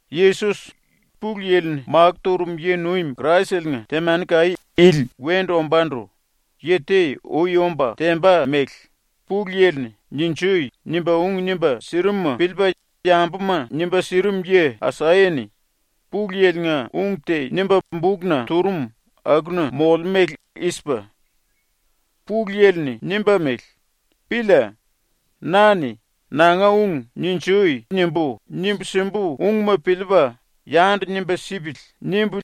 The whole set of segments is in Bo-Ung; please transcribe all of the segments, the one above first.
⸤Yesos, Pulu Yili-ni makó turum yi-nuim Kraisele-nga temani-kaí ili wendu ombándu yi te ui omba temba mele⸥ Pulu Yili-ni “Ninjui!” nimba ung nimba sirimuma piliipa yambuma nimba sirim yi Asaya-ni Pulu Yili-nga ung te nimba bukna turum akuna molemú mele i-sipa: ‘⸤Pulu Yili-ni nimba mele:⸥ “⸤Pília.⸥ Na-ni ‘ ‘Nanga ung “Ninjui!” nimbu, nimbu simbu ungma piliipa yandu nimba sipili.’ nimbu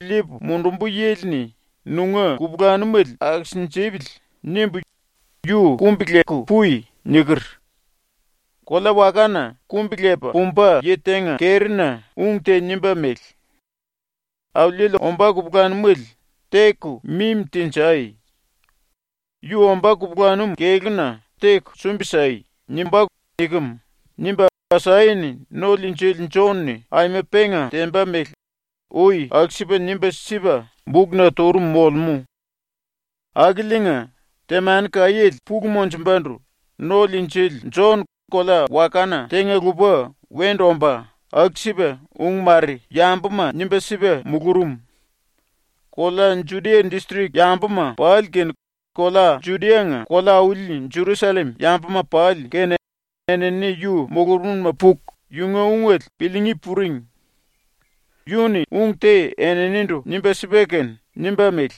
liipu mundumbu yili-ni nunga kupulanumele akisinjipili.’ nimbu yu “Kumbi-leku pui.” niker.’ ‘Kolea-wakana ⸤kumbi-lepa pumba⸥ yi tenga kerina ung te nimba mele: “Auliele ombá kupulanumele teku mimi tenjai. Yu ombá kupulanum kelúma teku sumbi sai.” nimbá.” nikem.’ nimba ⸤Asaya-ni No-Liinjili Jon-ni aima penga temba mele ui aku-sipa nimba sipa bukna turum molemú.⸥ Akiliinga, ⸤temani-kaiéle pulu monjumbandu No-Liinjili⸥ Jon kolea-wakana tenga-lupa wendu omba ⸤aku-sipa⸥ ung mare yambuma nimba sipa mulurum. Kolea Judia distrik yambuma pali kene kolea Judia-nga kolea-auli Jerusallem yambuma pali kene enini yu mulurumna puku yunga ungele piliingí puring. Yu-ni ung te eninindu nimba sipa kene nimba mele: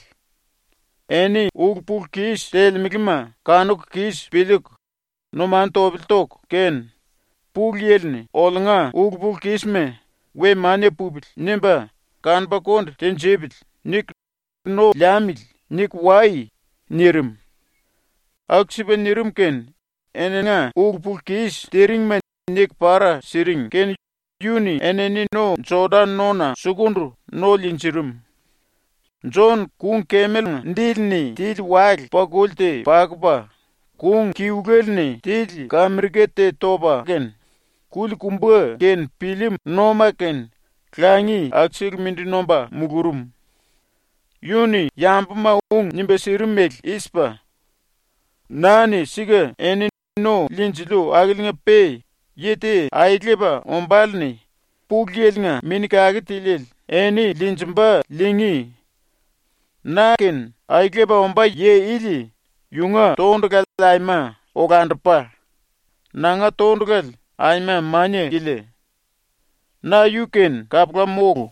“Eni ulu-pulu-kis telemelema kanuku kis piliiku numanu topele toku kene ‘Pulu Yili-ni oliunga ulu-pulu-kisma ‘We mania pupili.’ nimba kanupa konde tinjipili.’ niku ‘No liamili.’ niku wai.” nirim. Aku-sipa nirim kene eninga ulu-pulu-kis tiringma niku para siring kene yu-ni enini no-Jodan nona sukundu no liinjirim. Jon kung-kemelenga dili-ni tili wale-pakuli te pakupa, kung kiluele-ni tili kamirika te topa kene, kuli-kumba kene pillím-nóma kene ⸤langi⸥ akusele mindi nomba mulurum. Yu-ni yambuma ung nimba sirim mele i-sipa: “Na-ni sika eni no liinjiliu akiliinga-pe yi te aelepa ombále-ni ⸤Pulu Yili-nga⸥ Mini Kake Tiliele eni liinjimba ⸤liingí⸥. Na-kene aelepa ombá yi ili yunga tondulale aima olandupa, nanga tondulale aima mania-kilia. Na yu-kene kapula mólu.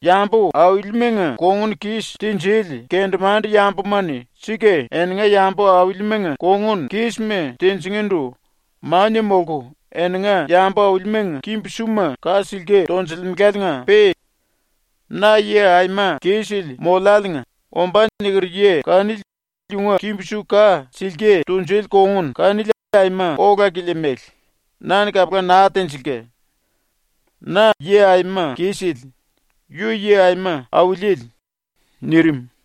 Yambu aulimanga kongun kis tinjili kendemande-yambuma-ni sika eninga yambu aulimanga kongun kísma tinjingíndu mania molku eninga yambu aulimanga kimbu-suma ka silke tonjilimelaliinga-pe na yi aima kisele moliáliinga ombá niker yi kanili yunga kimbu-su ka silke tunjuli kongun kanili aima ola-kilia mele, na-ni kapula naa tenjilka. ⸤Na yi aima kisele, yu yi aima auliele.⸥” nirim.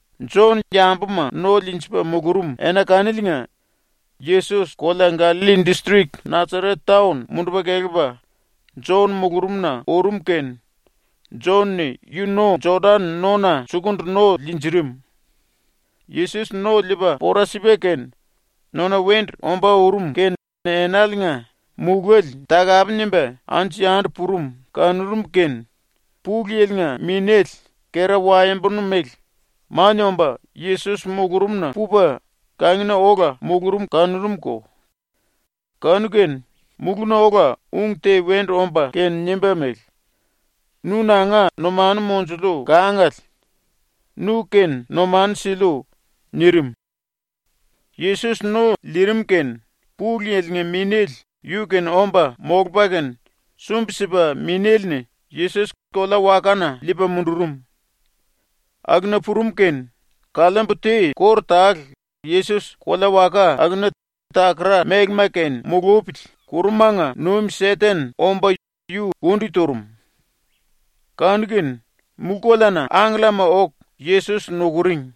⸤Jon yambuma no liinjipa mulurum⸥ ena kaniliinga Yesos kolea Gallalli distrik Nasaret taon mundupa kelepa ⸤Jon mulurumna⸥ urum kene Jon-ni yu no Jodan nona sukundu no liinjirim. ⸤Yesos no liipa pora sipa kene⸥ nona wendu ombá urum kene enaliinga muléle takape nimba anju-yandu purum kanurum kene, Pulu Yili-nga Minéle, kera-waembonu mele, mania omba Yesos mulurumna pupa ⸤kangina⸥ ola mulurum kanurumko. Kanu-kene mulúna ola ung te wendu omba kene nimba mele: “Nu nanga numanu monjuliu kangale. Nu-kene numanu siliu.” nirim. ⸤Yesos no liirim kene Pulu Yili-nga Minéle yu-kene omba molupa kene⸥ sumbi-sipa Minéle-ni Yesos kolea-wakana liipa mundurum. Akuna purum kene, kaliimbu te kóru tale Yesos kolea-waka akuna takara-mélema kene mulupili ⸤kurumanga nuim⸥ Seten omba yu kundi turum. Kanu-kene ⸤mulú-koleana⸥ angkellama oku Yesos nukuring.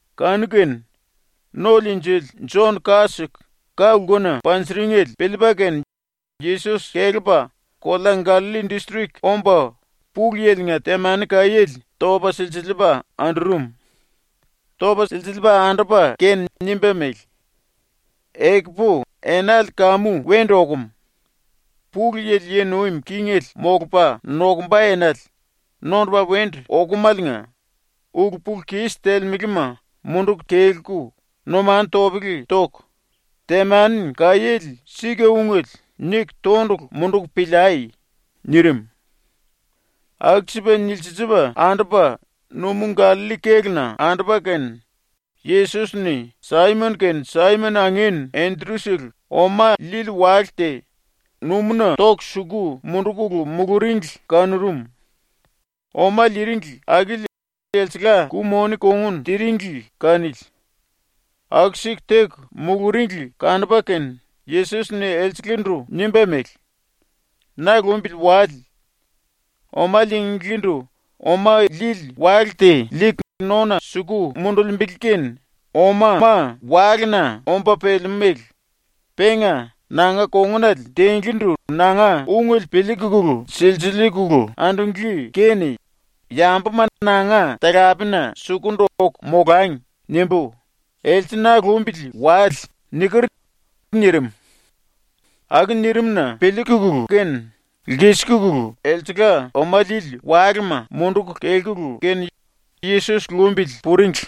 Kanu-kene ⸤No-Liinjili⸥ Jon ka siku ka-lkuna panjiringele piliipa kene Yesos kelepa kolea Gallalli distrik omba Pulu Yili-nga temani-kaiéle topa silsiliipa andurum. ⸤Topa silsiliipa andupa kene⸥ nimba mele: “Ekupu enale kamu wendu okum, Pulu Yili yi nuim kingele molupa nokumba enale nondupa wendu okumaliinga ulu-pulu-kis telemelema munduku kelku numanu topele toku, ‘Temani-kaiéle sika-ungele.’ niku tondulu munduku piliai.” nirim. ⸤Aku-sipa nilsiliipa andupa⸥ numú Gallalli kéluna andupa kene Yesos-ni Saimon kene Saimon angin Endru-sele oma liili wale te numúna toku suku mundukulu muluringli kanurum. Oma liiringli akili elsengla ku-moni kongun tiringli kanili. ⸤Aku-siku teku muluringli kanupa kene⸥ Yesos-ni elselendu nimba mele: “Na lumbili wale. Oma liinglíndu oma liili wale te liiku nona suku mundulimbili kene omama walena omba pelemú mele, penga ‘nanga kongunale tinglíndu nanga ungele piliikulu niku silsiliikulu andunglí kene yambuma nanga talapena sukundu oku molangi.’ nimbu ‘Else na lumbili wale.’ niker.” nirim. ⸤Aku nirim-na piliikulu kene⸥ lkisikulu elsengla oma liili walema munduku kelkulu kene Yesos lumbili puringli.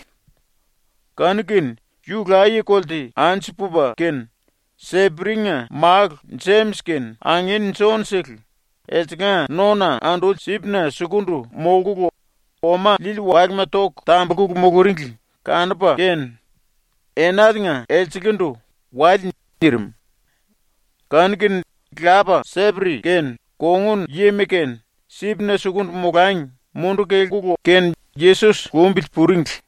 Kanu-kene yu laye-kolte anju pupa kene, Seperi-nga málu Jemis kene angin Jon-sele elsengla nona anduli sipna sukundu molkulu oma liili walema toku tambulku muluringli kanupa kene enaliinga elselendu “Wale.” nirim. Kanu-kene lapa Seperi kene kongun yima kene sipna sukundu molangi munduku kelkulu kene Yesos lumbili puringli.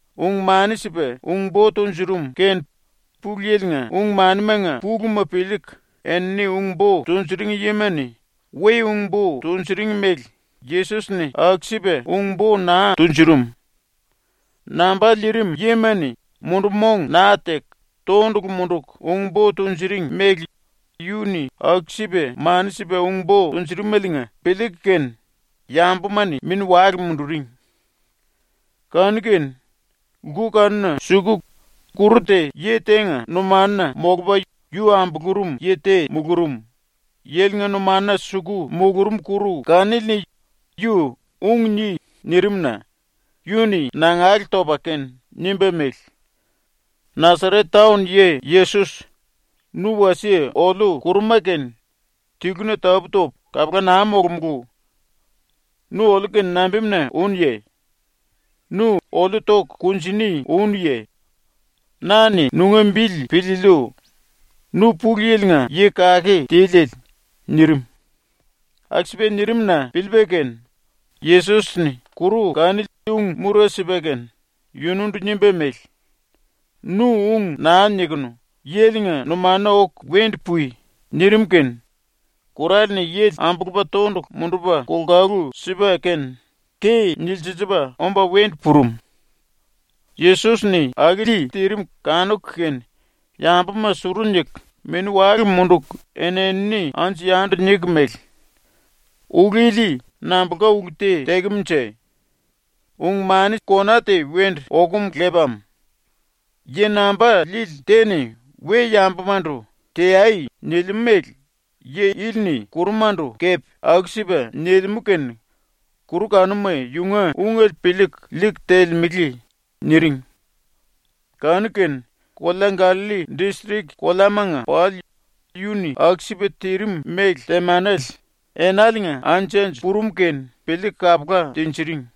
Ung-mani sipa ung-bo tunjurum kene Pulu Yili-nga ung-manimanga puluma piliiku enini ung-bo tunjuring yima-ni we ung-bo tunjuring mele Yesos-ni aku-sipa ung-bo naa tunjurum. Namba lirim yima-ni mundu-mong naa teku tondulu munduku ung-bo tunjuring mele yu-ni aku-sipa mani sipa ung-bo tunjurumeliinga piliiku kene yambuma-ni mini-wale munduring. Kanu-kene lku kanuna suku kuru te yi tenga numanuna molupa yu ambulurum yi te mulurum, ⸤yilinga numanuna suku mulurum kuru kanili-ni yu “Ung ni.” nirim-na⸥ yu-ni nangale topa kene nimba mele: “Nasaret taon yi Yesos, nu wasie oliu ⸤kuruma⸥-kene tiluna tapú-topu kapula naa molomulú. Nu oliu-kene nambimuna únuye? Nu oliu toku kunjini únuye? Na-ni nunga bili piliiliu. Nu Pulu Yili-nga Yi Kake Tiliele.” nirim. ⸤Aku-sipa nirim-na piliipa kene⸥ Yesos-ni kuru kanili ung-mura sipa kene yunundu nimba mele: “Nu ung naa nikunu yilinga numanuna oku wendu pui.” nirim kene kurale-ni yili ambulupa tondulu mundupa kolkalu sipa kene ke nilsiliipa omba wendu purum. ⸤Yesos-ni akili tirim kanuku kene⸥ yambuma suru niku, mini-wale munduku eni-enini anju-yandu niku mele: “Ulu ili nambulka ulu te tekemunje? Ung kona te wendu okum lepam. Yi namba lili te-ni we-yambumandu “Teai.” nilimú mele yi ili-ni kurumandu kepe aku-sipa nilimú kene kuru kanuma yunga ungele piliiku liiku telemele.” niring. Kanu-kene kolea Gallalli distrik koleamanga pali yu-ni aku-sipa tirim mele temanele enaliinga anju-anju purum kene piliiku kapula tinjiring.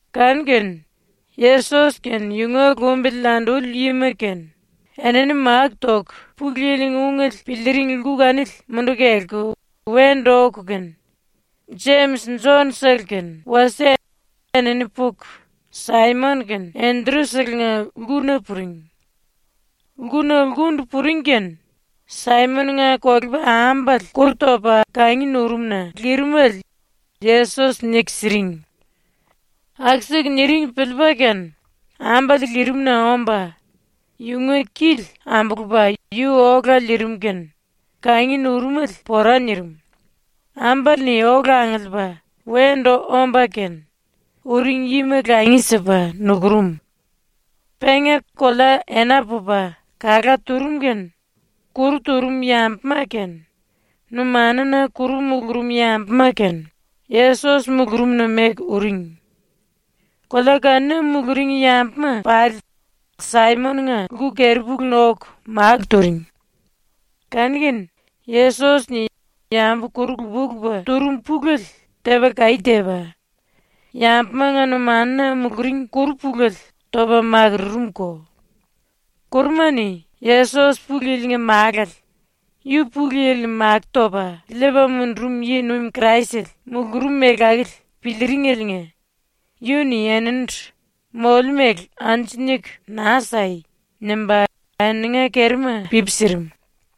Kanu-kene ⸤Yesos kene yunga lumbili anduli yima kene⸥ enini máku toku Pulu Yili-nga ungele piliiring lku kanili munduku kelku wendu oku kene, Jemis Jon-sele kene wasie enini puku Saimon kene Enderu-selenga lkuna puring. Lkuna lkundu puring kene Saimon-nga kolepa-ambale kuru topa kangi nurum-na lirimele Yesos niku siring. Aku-siku niring piliipa kene ambale lirimna omba yunga kili ambulupa yu ola liirim kene kangi nurumele pora nirim, ambale-ni ⸤ola angiliipa wendu omba kene⸥ uring-yima langi sipa nukurum. Penga kolea ena pupa kalá turum kene, kuru turum yambuma kene, numanuna kuru mulurum yambuma kene, Yesos mulurumna meku uring. Kolea kanuna muluring yambuma pali Saimon-nga lku-kirupuluna oku máku turing. Kanu-kene Yesos-ni yambu kuru lupa-lupa turum pulele tepa kaí tepa, yambumanga numanuna muluring kuru pulele topa makururumko. Kuruma-ni Yesos ⸤Pulu Yili-nga Málale, yu Pulu Yili-ni makó topa liipa mundurum yi-nuim Kraisele⸥ mulurum mele akili piliiringeliinga yu-ni eninindu “Moliu mele anju niku naa sai.” nimba eninga kerima pipi sirim.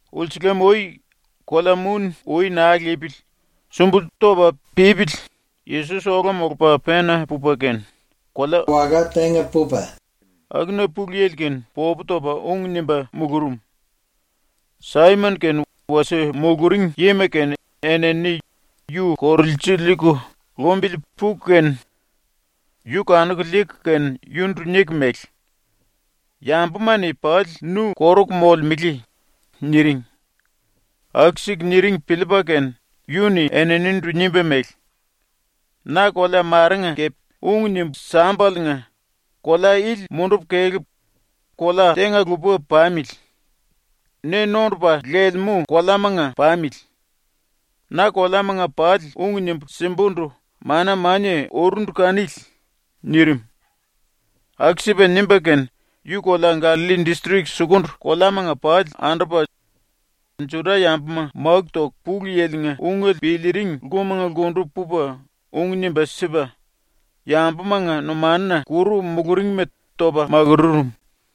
Ulsulam-ui, kolea muni ui naa lipili sumbulú topa pípili Yesos ola molupa pena pupa kene, kolea-waka tenga pupa, akuna Pulu Yili-kene popu topa ung nimba mulurum. Saimon kene wasie muluring yima kene enini yu korulsiliiku lumbili puku kene, yu kanuku liiku kene yunundu niku mele: “Yambuma-ni pali nu koruku molemele.” niring. ⸤Aku-siku niring piliipa kene⸥ yu-ni eninindu nimba mele: “Na kolea marenga kepe ung nimbu sámbaliinga kolea ili mundupu kelepu kolea tenga-lupa pamili. Ne nondupa lelemú koleamanga pamili. Na koleamanga pali ung nimbu simbundu mana-mania urundu kanili.” nirim. Aku-sipa nimba kene yu kolea Gallalli distrik sukundu koleamanga pali andupa Juda-yambuma máku toku Pulu Yili-nga ungele piliiring lkumanga lkundu pupa ung nimba sipa, yambumanga numanuna kuru muluringma topa makururum.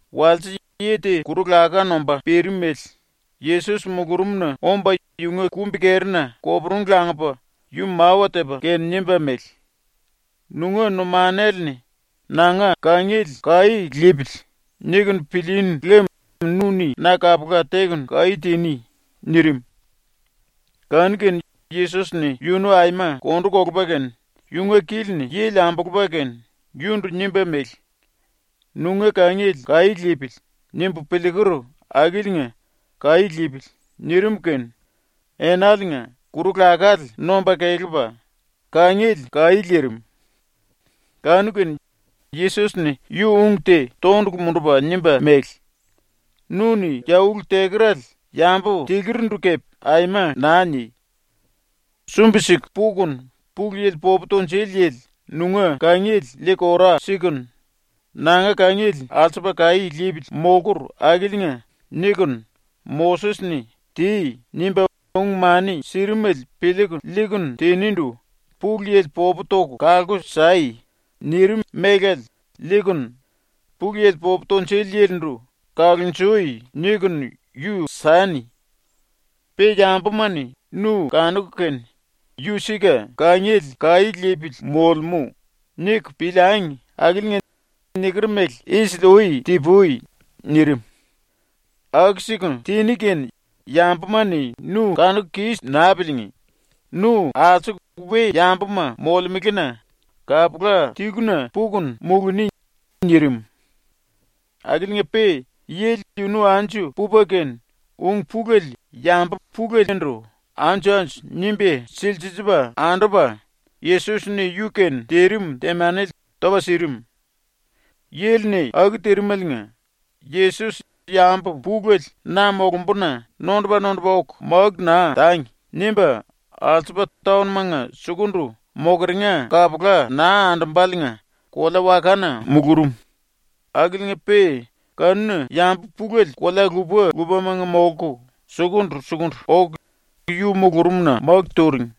Walse yi te kuru-laká nomba pirimele Yesos mulurumna omba yunga kumbi-kerina koporungu langupa yu mawa tepa kene nimba mele: “Nunga numanale-ni ‘Nanga kangiele kaí lipili.’ nikunu pilíínu lem nu-ni na kapula tekunu kaí tiní.” nirim. Kanu-kene Yesos-ni yunu aima kondu kolupa kene yunga kili-ni yili ambulupa kene yundu nimba mele: “‘Nunga kangiele kaí lipili.’ nimbu piliiker akiliinga kaí lipili.” nirim kene enaliinga kuru-lakále nomba kelepa, kangiele kaí lirim. Kanu-kene Yesos-ni yu ung te tondulu mundupa nimba mele: “Nu-ni ya ulu tekerale yambu tilurindu kepe aima naa ni! Sumbi-siku pukunu Pulu Yili popu tunjuli yili nunga kangiele liiku ora sikunu, ‘Nanga kangiele alsupa kaí lipili molkur akiliinga.’ nikunu Moses-ni “Ti.” nimba ung-mani sirimele piliiku liikunu tinindu “Pulu Yili popu toku kalku sai.” nirim mélale liikunu Pulu Yili popu tunjuli yilindu “Kalonjui.” nikunu yu sani. Pe yambuma-ni nu kanuku kene ‘Yu sika kangiele kaí lipili molemú.’ niku piliangi akiliinga niker mele isili-ui ti-pui.” nirim. ⸤“Aku-siku tiní kene yambuma-ni nu kanuku kis naa piliingí, nu alsuku we-yambuma molemelena kapula tiluna pukunu muluni.” nirim.⸥ Akiliinga-pe yili yunu anju pupa kene ung pulele yambu pulelendu anju-anju nimba silsiliipa andupa, Yesos-ni yu-kene tirim temanele topa sirim. Yili-ni aku tirimeliinga Yesos ⸤‘Yambu pulele na molumbuna nondupa-nondupa oku máku naa tangi.’ nimba⸥ alsupa taon-manga sukundu mokeringa kapula naa andumbaliinga kolea-wakana mulurum, akiliinga-pe kanuna yambu pulele kolea lupa-lupamanga molku sukundu-sukundu oku yu mulurumna máku turing.